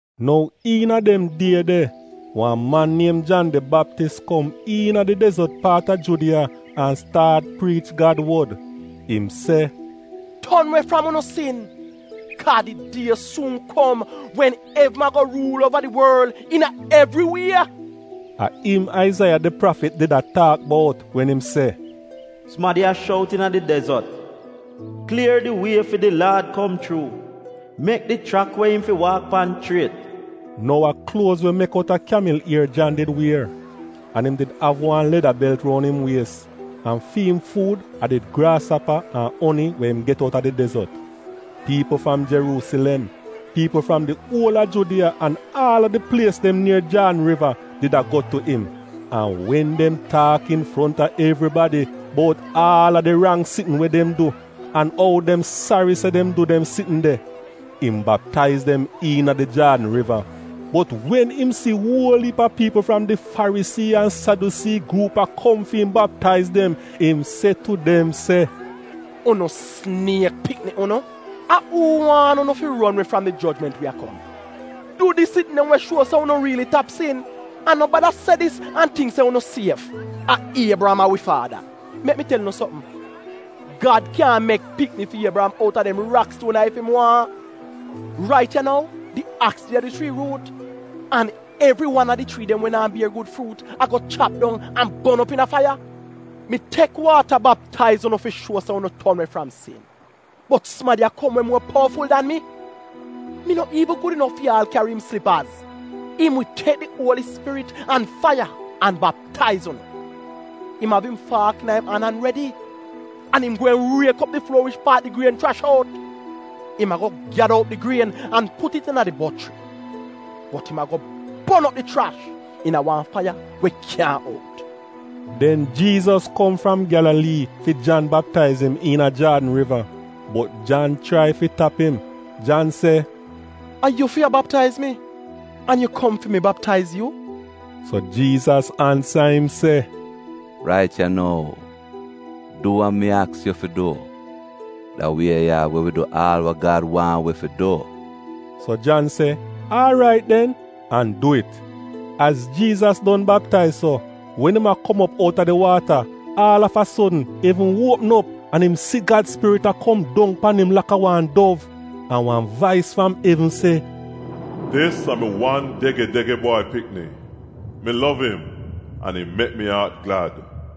Nou iina dem die de, wan man niem Jan di Baptis kom iina di dezot paat a Judiya an staat priich Gad wod. Im se, “Ton we fram unu sin, kaa di die suun kom wen evn ago ruul uova di worl iina evri wie!” A im Aizaiya, di prafit, did a taak bout wen im se: “Sumadi a shout iina di dezot, ‘Klier di wie fi di Laad kom chuu, mek di chrak we im fi waak pan chriet.’” Nou a kluoz we mek outa Kyamil ier Jan did wier, an im did av wan leda belt roun im wies. An fi im fuud a did graasapa an oni we im get outa di dezot. Piipl fram Jeruusilem, piipl fram di uol a Judiya an aal a di plies dem nier Jaadn riva did a go tu im, an wen dem taak infronta evribadi bout aal a di rang sitn we dem du, an ou dem sari se dem du dem sitn de, im baptaiz dem iina di Jaadn Riva. Bot wen im si uol iip a piipl fram di Farisii an Sadyusii gruup a kom fi im baptaiz dem, im se tu dem se, “Unu siniek pikni unu! A uu waan unu fi ron we fram di jojment we a kom? Du di sitn dem we shuo se unu riili tap sin. An no bada se dis an tingk se unu sief: ‘A Iebriyam a wi faada.’ Mek mi tel unu sopm, Gad kyan mek pikni fi Iebriyam outa dem rakstuon ya ef im waahn! Rait ya nou di aks de a di chrii ruut. An evri wan a di chrii dem we naa bier gud fruut ago chap dong an bon op iina faiya. “Mi tek waata baptaiz unu fi shuo se unu ton we fram sin. Bot sumadi a kom we muo powaful dan mi. Mi no iivn gud inof fi aal kyari im slipaz. Im wi tek di Uoli Spirit an faiya, an baptaiz unu. Im av im faak iina im an redi, an im ago riek op di fluor wich paat di grien chrash out. Im ago gyada op di grien an put it iina di bochri, bot im ago bon op di chrash iina wan faiya we kyaahn out.” Den Jiizas kom fram Gyalalii fi Jan baptaiz im iina Jaadn Riva. Bot Jan chrai fi tap im. Jan se, “A yu fi a baptaiz mi, an yu kom fi mi baptaiz yu?” So Jiizas ansa im se, “Rait ya nou, du wa mi aks yu fi du, da wie ya wi wi du aal we Gad waahn wi fi du!” So Jan se aarait den an du it. Az Jiizas don baptaiz so, wen im a kom op outa di waata aal av a sodn evn uopm op an im si Gad Spirit a kom dong pan im laka wan dov. An wan vais fram evn se, “Dis a mi wan dege-dege Bwai Pikni, mi lov im, an im mek mi aat glad.”